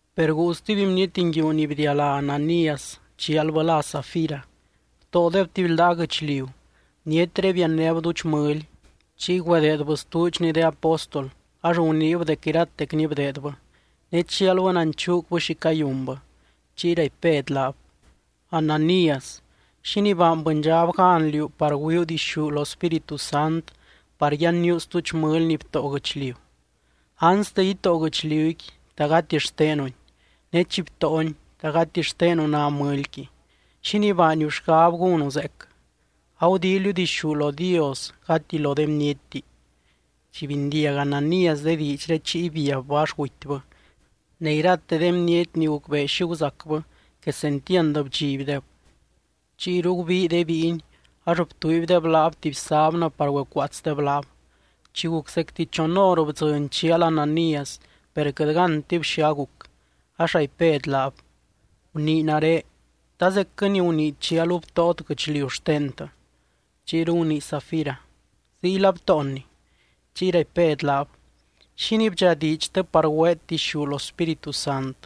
Per guu stuby bniety nguiu ni bdialá Ananías, chialbɨ lá Safira. Btóodeb tuby ldaa guɨchliu. Bnietré biannéb duudx mɨly. Chiy güedeedbɨ stuudxni de apóstol, ax guniib dec iratecni bdeedbɨ. Ne chialbɨ nanchuucbɨ xi cayunbɨ. Chiy raipy Bed laab: —Ananías, ¿xínii baany bɨndxab gan liú par güiuu dixú lo Spíritu Sant par yanníu stuudx mɨly ni btóo guɨchliu? Anste itóo guɨchliuqui, ¿ta gati xtenuni? Ne chi btóoni, ¿ta gati xtenu ná mɨlyqui? ¿Xínii baaniu xgab gúnu zeec? Agudíiliu dixú lo Dios gati lo de bnietti. Chi bindiag Ananías de diidxré, chiy biabbɨ ax gutybɨ. Ne irate de bniety ni gucbee xi guzacbɨ, quesentiand bdxibdeb. Chiyru gubii de bíiny, ax btuuibdeb laab tuby sábnɨ par güecuaatsdeb laab. Chi guc zecti chon hor bdzɨny chial Ananías. Per quɨt gántib xi aguc. Ax raipy Bed laab: —Gunii nare, ¿ta zecquɨ ni gunii chialu btóot guɨchliu xtentɨ? Chiyru gunii Safira: —Ziyla btóonni. Chiy raipy Bed laab: —¿Xínii bdxadiidxtɨ par güeet dixú lo Spíritu Sant?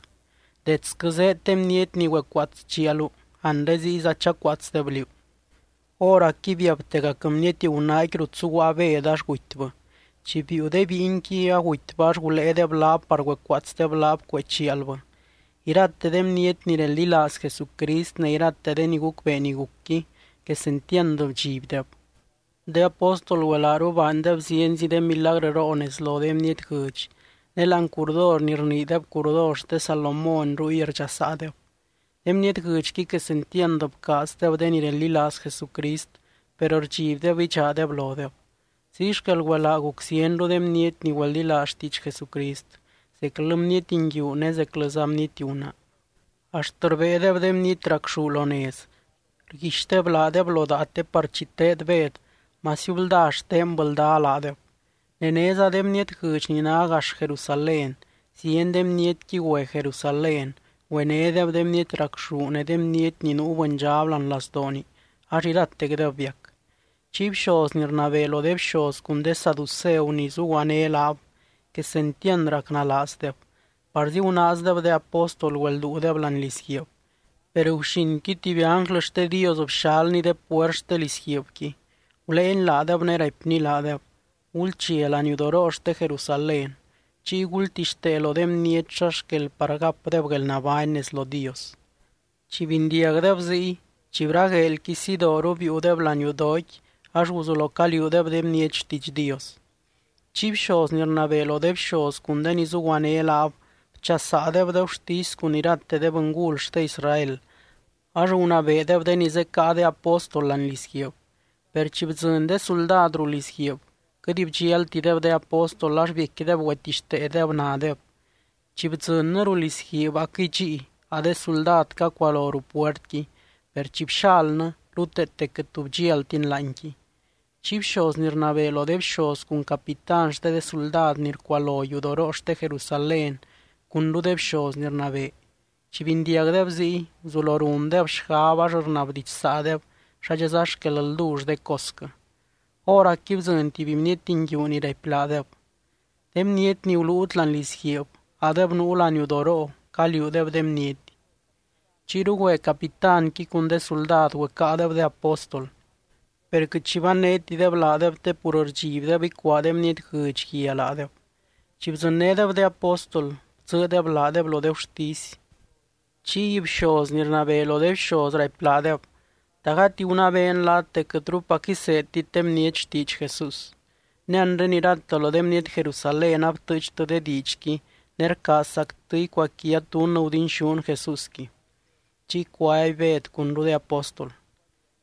Detsquɨ zéed de bniety ni güecuaats chialu. Anre ziyza chacuaatsdeb liú. Hóracqui biabtegac bniety gunaaqui rut zuguaa Bed ax gutybɨ. Chi biiu de bíinqui, agutybɨ ax guléedeb laab par güecuaatsdeb laab cuee chialbɨ. Irate de bniety ni reldilaaz Jesucrist, ne irate de ni gucbee ni gucqui, quesentiand bdxibdeb. De apóstol güelaaru baandeb zienzi de milagrɨroo nez lo de bniety guɨdx. Ne láani curdor ni rniideb curdor xte Salomón ruy rdxasaadeb. De bniety guɨdxqui quesentiand bcaazdeb de ni reldilaaz Jesucrist, per rdxibdeb idxaadeb lodeb. Ziy xquel güelaa guc zienru de bniety ni güeldilaaz xtiidx Jesucrist, zeclɨ bniety nguiu ne zeclɨza bniety gunaa. Axt rbéedeb de bniety racxú lo nez. Rguixdeb laadeb lo daa te par chi teed Bed, masiu blda xtenbɨ lda laadeb. Ne néza de bniety guɨdx ni ná gax Jerusalén, zieny de bnietqui güe Jerusalén. Güenédeb de bniety racxú ne de bniety ni nuu bɨndxab láani lazdooni ax iratecdeb biac. Chiy bxoz ni rnabee lo de bxoz cun de saduceu ni zuguané laab, quesentiand racnalaazdeb. Parzi gunaazdeb de apóstol güelduudeb láani lizguiib. Per guxinqui tuby ánglɨ xte Dios bxalny de puert xte lizguiibqui. Guléeny laadeb ne raipny laadeb: —Gulchia laniudoroo xte Jerusalén. Chiy gultixtee lo de bniety xa xquel par gapdeb guelnabány nez lo Dios. Chi bindiagdeb ziy, chi bragueelqui sidooru, biiudeb laniudooqui ax guzulo caliuudeb de bniety xtiidx Dios. Chiy bxoz ni rnabee lo de bxoz cun de ni zuguané laab bchasaadeb de gurtisy cun irate de bɨngul xte Israel, ax gunabeedeb de ni zecáa de apóstol láani lizguiib. Per chi bdzɨny de suldad ruu lizguiib, quɨt bdxialtideb de apóstol ax biecquideb güetixteedeb nadeb: —Chi bdzɨnnɨ ruu lizguiib aquɨy dxíi, a de suldad cacualo ruu puertqui. Per chi bxalnɨ, ruteete quɨt tu bdxialtin láanqui. Chiy bxoz ni rnabee lo de bxoz cun capitán xte de suldad ni rcualo yudoroo xte Jerusalén cunru de bxoz ni rnabee, chi bindiagdeb ziy, guzulo rundeb xgab ax rnabdidxsaadeb xadxa xquel ldull de cosquɨ. Hóracqui bdzɨny tuby bniety nguiu ni raipy laadeb: —De bniety ni guluut láani lizguiib, adeb nuu laniudoroo. Caliuudeb de bniety. Chiyru güe capitánqui cun de suldad güecáadeb de apóstol. Per quɨt xi bannétideb laadeb te pur rdxibdeb icuaa de bniety guɨdx guia laadeb. Chi bdzɨnnédeb de apóstol, bdzɨɨdeb laadeb lo de gurtisy. Chiy bxoz ni rnabee lo de bxoz raipy laadeb: —¿Ta gati gunabeen laat dec quɨtrupac iseedtit de bniety xtiidx Jesús? Ne anre irate lo de bniety Jerusalén abtɨɨchtɨ de diidxqui, ne rcaazzactɨ icuaquiat dunnɨ gudinxún Jesúsqui. Chiy cuaby Bed cunru de apóstol: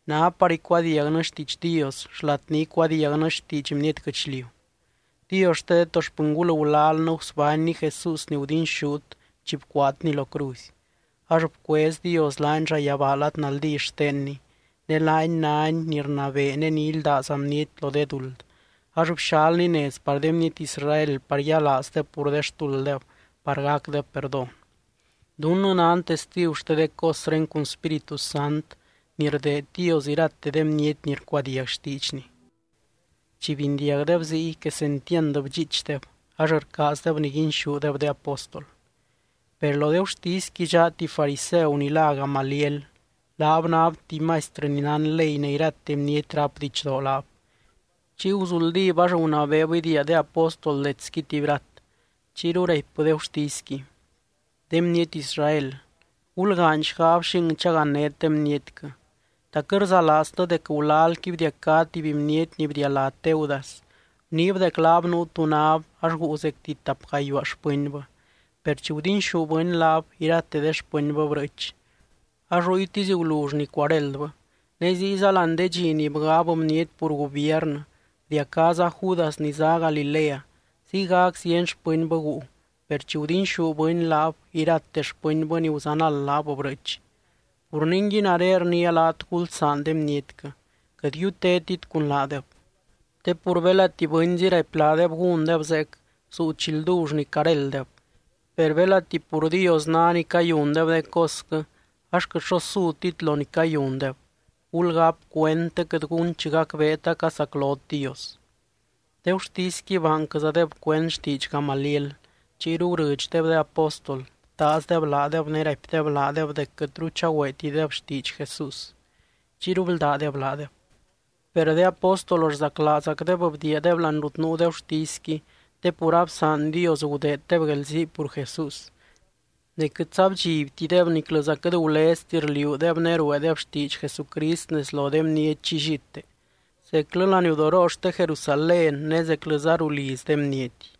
—Ná par icuadiagnɨ xtiidx Dios xlat ni icuadiagnɨ xtiidx bniety guɨchliu. Dios xte de to xpɨngul gulalnɨ gusbánny Jesús ni gudinxút chi bcuaatny lo cruzy. Ax bcuez Dios laany llayabaa lad naldí xtenny, ne laany nány ni rnabee ne ni ildáza bniety lo de duld, ax bxalny nez par de bniety Israel par yialaazdeb pur xtulddeb par gacdeb perdón. Dunnɨ nan testigu xte de cosré cun Spíritu Sant ni rdeed Dios irate de bniety ni rcuadiag xtiidxny. Chi bindiagdeb ziy, quesentiand bdxiichdeb ax rcaazdeb niguinxúdeb de apóstol. Per lo de gurtisqui dxaa tuby fariseu ni lá Gamaliel. Laab náb tuby maistrɨ ni nán ley ne irate bniety rápdeb didxdoo laab. Chiy guzuldíb ax gunabeeb idiia de apóstol detsqui tuby rat. Chiyru raipbɨ de gurtisqui: —De bniety Israel, gulgaany xgab xing chagannét de bnietquɨ. ¿Ta quɨt rzalaaztɨ dec gulalqui bdiacá tuby bniety ni bdialá Teudas? Guniib dec laab nuu tu náb ax guu zecti tap gayuaa xpɨnbɨ. Per chi gudinxú bɨny laab, irate de xpɨnbɨ brɨɨch. Ax ruytisy gulull ni cuaréldbɨ. Ne ziyza láani de dxi ni bgab bniety pur gubiernɨ, bdiacáza Judas ni zá Galilea. Ziygac zieny xpɨnbɨ guu, per chi gudinxú bɨny laab, irate xpɨnbɨ ni guzanald laab brɨɨch. Pur ningui, nare rniia laat gulsaan de bnietquɨ, quɨt yutétit cun laadeb. Te pur belati bɨnzi raipy laadeb gúndeb zeec, zuu chi ldull ni carélddeb. Per belati pur Dios ná ni cayundeb de cosquɨ, ax quɨt xo sutit lo ni cayundeb. Gulgáp cuend, te quɨt gun chi gacbeet acasaclot Dios. De gurtisqui baanquɨzadeb cuend xtiidx Gamaliel. Chiyru gurɨdxdeb de apóstol, btaazdeb laadeb, ne raipdeb laadeb dec quɨtru chagüeetideb xtiidx Jesús. Chiyru bldádeb laadeb. Per de apóstol rzaclaazgacdeb bdiiadeb láani rut nuu de gurtisqui, te pur absaan Dios gudeeddeb guelzii pur Jesús. Ne quɨtza bdxibtideb niclɨza quɨt gulezti rliuudeb ne rueedeb xtiidx Jesucrist nez lo de bniety llillite, zeclɨ laniudoroo xte Jerusalén ne zeclɨza ruu liz de bniety.